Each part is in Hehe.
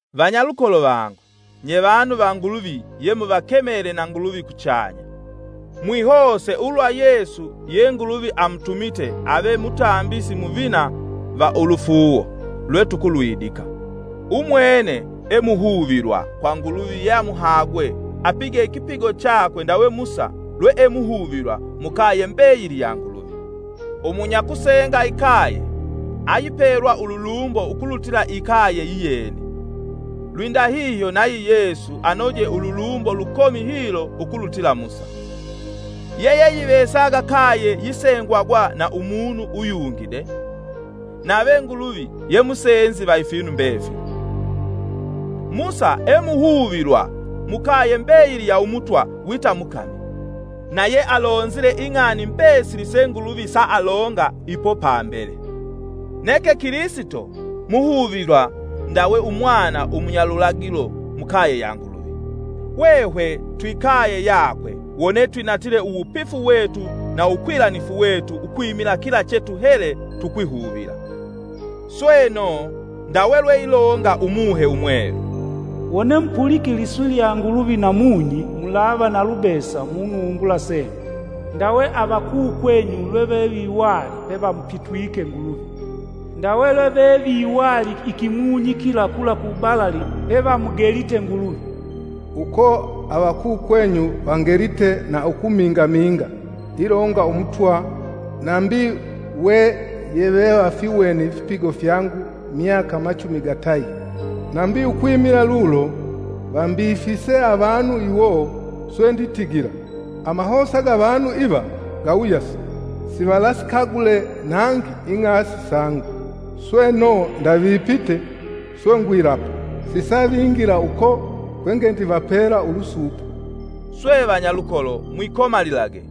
Vanyalukolo vangu, nye vanu va Nguluvi yemuvakemele na Nguluvi kuchanya, mwihose ulwa Yesu ye Nguluvi amutumite ave Mutambisi Muvina va ulufuuwo lwetukulwindika. Umwene e muhuvilwa kwa Nguluvi yeamuhagwe, apige ikipigo chakwe ndawe Musa lweemuhuvilwa mukaye mbeyili ya Nguluvi. Umunyakusenga ikaye ayipelwa ululumbo ukulutila ikaye yiyene. Lwindahihyo nayi Yesu anoje ululumbo lukomi hilo ukulutila Musa. Yeyeyivesaga kaye yisengwagwa na umunu uyungi de—nave Nguluvi ye musenzi va ifinu mbefili. Musa emuhuvilwa mukaye mbeyili ya Umutwa wita mukami, na yealonzile ing'ani mbesili se Nguluvi saalonga ipo pambele. Neke Kilisito muhuvilwa ndawe umwana umunyalulagilo mukaye ya Nguluvi. Hwehwe twikaye yakwe wone twinatile uwupifu wetu na uwukwilanifu wetu ukwimila kila chetuhele tukwihuvila. Sweno, ndawe lweilonga Umuhe Umwelu: “Wone mupulike liswi lya Nguluvi namunyi, Mulava nalubesa munumbula senyu ndawe avakukwenyu lweveviwali; pevamupitwike Nguluvi; Ndawe lweveviwali ikimunyi kila kula ku balali, pevamugelite Nguluvi. Uko avakukwenyu vangelite na ukumingaminga, ilonga Umutwa, nambi we yevevafiwene ifipigo fyangu myaka machumi gatayi. Nambi ukwimila lulo vambifise avanu iwo swe nditigila, ‘Amahosa ga avanu iva ga wuyasi, sivalasikagule nangi ing'asi sangu.’ Sweno, ndavipite, swe ngwilapa: ‘Sisavingila uko kwe ngendivapela ulusuupo.’” Swe vanyalukolo, mwikomalilage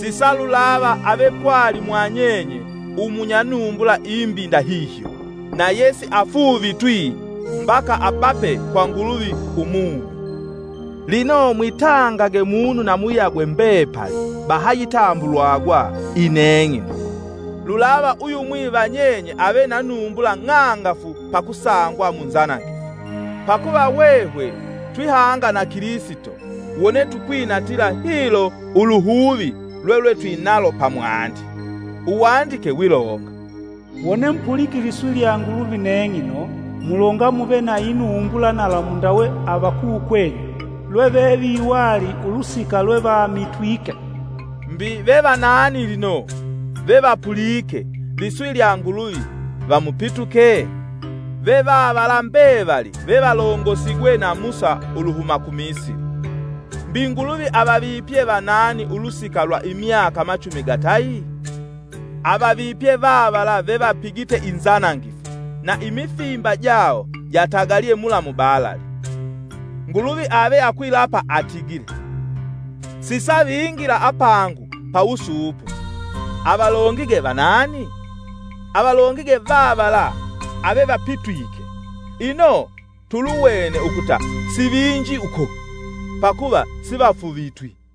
sisalulava ave pwali mwanyenye munya numbula imbi ndahihyo na yesiafuuvitwi mbaka abape kwa Nguluvi umumi. Lino mwitangage munu na muyagwe mbepali, bahayitambulwagwa. “Ineng'ino.” Lulava uyumwi va nyenye ave na numbula ng'angafu pakusangwa munzanangifu. Pakuva hwehwe twihanga na Kilisito, wone tukwinatila hilo uluhuvi lwetwetwinalo pamwandi: Uwandike wilonga: “Wone mupulike liswi lya Nguluvi neng'ino, mulonga muve na inumbula nalamu ndawe avakukwenyu lweveviwali ulusika lwevamitwike.” Mbi ve vanani lino, vevapulike liswi lya Nguluvi vamupituke? Ve vavala mbevali vevalongosigwe na Musa uluhuma ku Misili. Mbi Nguluvi avavipye vanani ulusika lwa imyaka machumi gatayi? Avavipye vavala vevapigite inzanangifu, na imifimba jawo jatagalye mula mubalali. Nguluvi ave akwilapa atigile, “Sisavingila apangu pawusuupo.” Avalongige vanani? Avalongige vavala avevapitwike. Ino, tuluwene ukuta sivinji uko. Pakuva sivafuuvitwi.